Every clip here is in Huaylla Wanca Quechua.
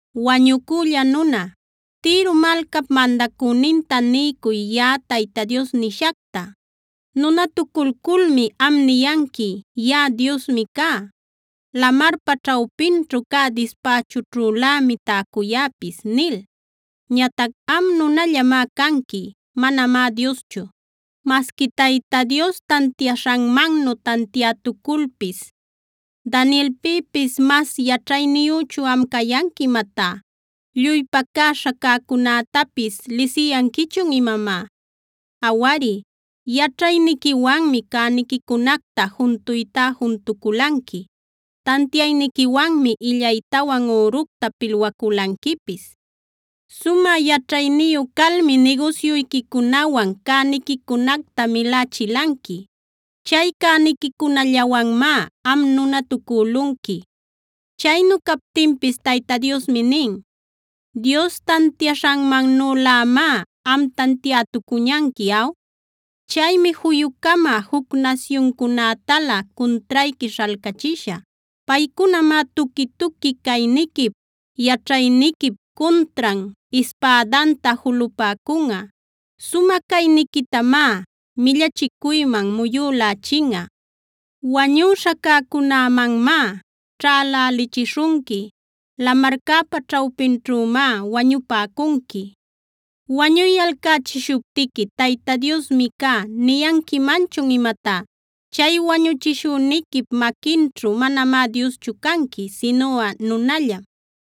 “Wañucülla nuna, Tiro malcap mandacüninta niycuy yaꞌa Tayta Dios nishacta: “ ‘Nunatuculculmi am niyanqui: “Yaꞌa diosmi cá. Lamarpa ćhawpinćhu cä dispächućhülämi täcuyäpis” nil. Ñatac am nunallamá canqui; manamá Dioschu, masqui Tayta Dios tantiaśhanmannu tantiätuculpis. ¿Danielpïpis mas yaćhayniyüchun am cayanqui imatá? ¿Lluy pacäśha cäcunätapis lisiyanquichun imamá? Awari, yaćhayniquiwanmi cäniquicunacta juntuytá juntuculanqui; tantiayniquiwanmi illaytawan üructa pilwaculanquipis. Sumä yaćhayniyu calmi nigusyuyquicunawan cäniquicunacta milächilanqui. Chay cäniquicunallawanmá am nunatucülunqui. “ ‘Chaynu captinpis Tayta Diosmi nin: “ ‘¿Dios tantiaśhanmannülämá am tantiätucuñanqui aw? Chaymi juyu-cama juc nasyuncunätalä cuntrayqui śhalcachishä. Paycunamá tuqui-tuqui cayniquip, yaćhayniquip cuntran ispädanta julupäcunꞌa. Sumä cayniquitamá millachicuyman muyülächinꞌa. Wañüśha cäcunämanmá ćhälälichishunqui. Lamarcäpa ćhawpinćhümá wañupäcunqui. ¿Wañuyalcächishuptiqui “Tayta Diosmi cá” niyanquimanchun imatá? Chay wañuchishüniquip maquinćhu manamá dioschu canqui, sinuꞌa nunallam.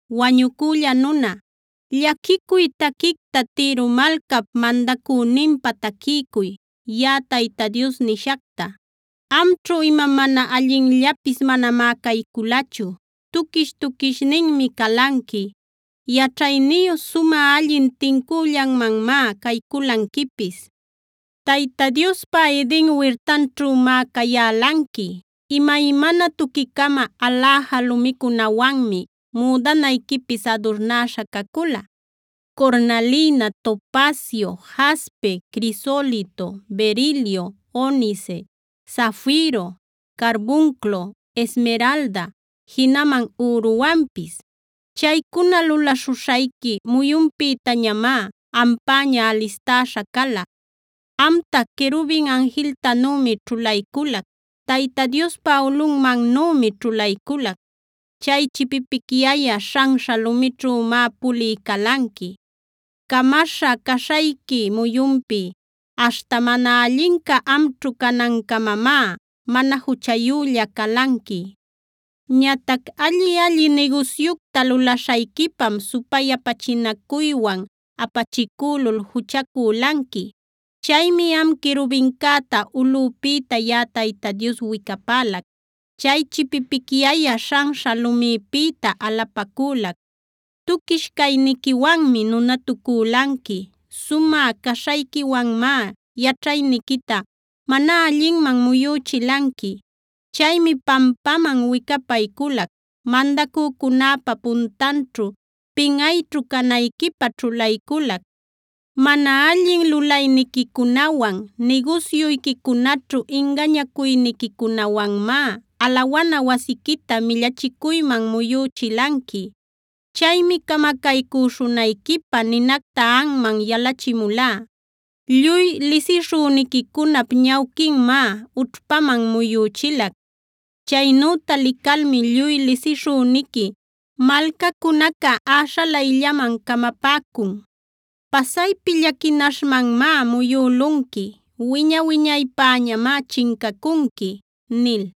“Wañucülla nuna, llaquicuy taquicta Tiro malcap mandacüninpä taquiycuy, yaꞌa Tayta Dios nishacta: “Amćhu ima mana allinllapis manamá cayculachu. Tuquish tuquishninmi calanqui. Yaćhayniyu, sumä allin tincüllanmanmá cayculanquipis. Tayta Diospa Eden wirtanćhümá cayälanqui. Imaymana tuqui-cama aläja lumicunawanmi müdanayquipis adurnäśha cacula: cornalina, topacio, jaspe, crisolito, berilio, onice, zafiro, carbunclo, esmeralda, jinaman üruwanpis. Chaycuna lulaśhuśhayqui muyunpïtañamá ampäña alistäśha cala. Amta, querubin anjiltanümi ćhulayculac; Tayta Diospa ulꞌunmannümi ćhulayculac. Chay chipipicyayä śhanśha lumićhümá pulï calanqui. Camaśha caśhayqui muyunpi aśhta mana allinca amćhu canancamamá mana juchayülla calanqui. Ñatac alli-alli nigusyucta lulaśhayquipam supayapachinacuywan apachicülul juchacülanqui. Chaymi am querubincäta ulꞌüpïta yaꞌa Tayta Dios wicapälac; chay chipipicyayä śhanśha lumïpïta alapacülac. Tuquish cayniquiwanmi nunatucülanqui. Sumä caśhayquiwanmá yaćhayniquita mana allinman muyüchilanqui. Chaymi pampaman wicapayculac; mandacücunäpa puntanćhu pinꞌayćhu canayquipä ćhulayculac. Mana allin lulayniquicunawan, nigusyuyquicunaćhu ingañacuyniquicunawanmá alawana wasiquita millachicuyman muyüchilanqui. Chaymi camacaycüśhunayquipä ninacta anman yalachimulá. Lluy lisishüniquicunap ñawquinmá ućhpaman muyüchilac. Chaynüta licalmi lluy lisishüniqui malcacunaca äśhalayllaman camapäcun. Pasaypi llaquinaśhmanmá muyülunqui. Wiña-wiñaypäñamá chincacunqui” nil.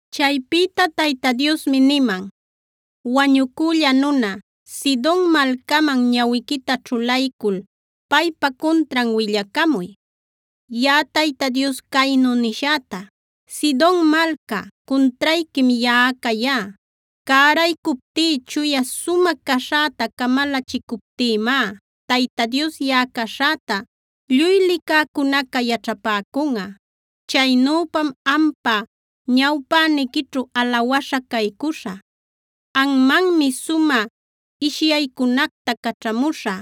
Chaypïta Tayta Diosmi niman: “Wañucülla nuna, Sidon malcaman ñawiquita ćhulaycul paypa cuntran willacamuy, yaꞌa Tayta Dios caynu nishäta: “ ‘Sidon malca, cuntrayquim yaꞌa cayá. Cäraycuptí, chuya sumä caśhäta camalachicuptïmá Tayta Dios yaꞌa caśhäta lluy licäcunaca yaćhapäcunꞌa. Chaynüpam ampa ñawpäniquićhu alawaśha caycuśhä. Anmanmi sumä ishyaycunacta caćhamuśhä;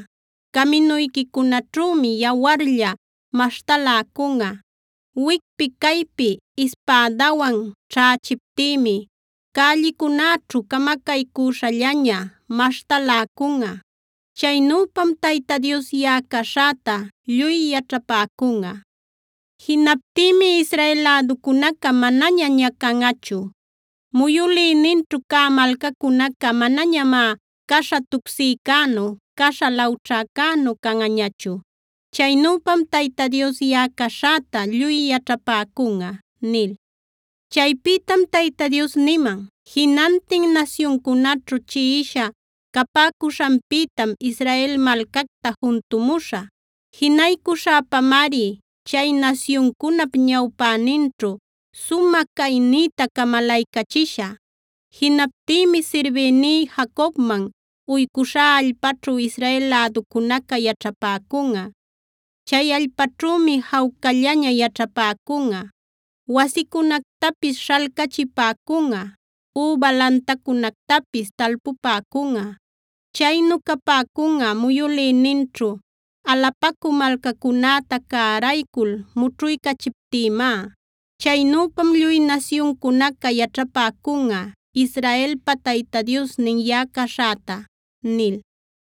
caminuyquicunaćhümi yawarlla maśhtaläcunꞌa. Wicpi-caypi ispädawan ćhächiptïmi cällicunäćhu camacaycüśhallaña maśhtaläcunꞌa. Chaynüpam Tayta Dios yaꞌa caśhäta lluy yaćhapäcunꞌa. “ ‘Jinaptïmi Israel läducunaca manaña ñacanꞌachu. Muyülïninćhu cä malcacunaca manañamá caśha tucsïcänu, caśha lawćhacänu canꞌañachu. Chaynüpam Tayta Dios yaꞌa caśhäta lluy yaćhapäcunꞌa’” nil. Chaypïtam Tayta Dios niman: “Jinantin nasyuncunaćhu chiꞌisha capäcuśhanpïtam Israel malcacta juntumuśhä. Jinaycuśhäpamari chay nasyuncunap ñawpäninćhu sumä caynïta camalaycachishä. Jinaptïmi sirbïní Jacobman uycuśhá allpaćhu Israel läducunaca yaćhapäcunꞌa. Chay allpaćhümi jawcallaña yaćhapäcunꞌa, wasicunactapis śhalcachipäcunꞌa, üba lantacunactapis talpupäcunꞌa. Chaynu capäcunꞌa muyülïninćhu alapacü malcacunäta cäraycul mućhuycachiptïmá. Chaynüpam lluy nasyuncunaca yaćhapäcunꞌa Israelpa Tayta Diosnin yaꞌa caśhäta” nil.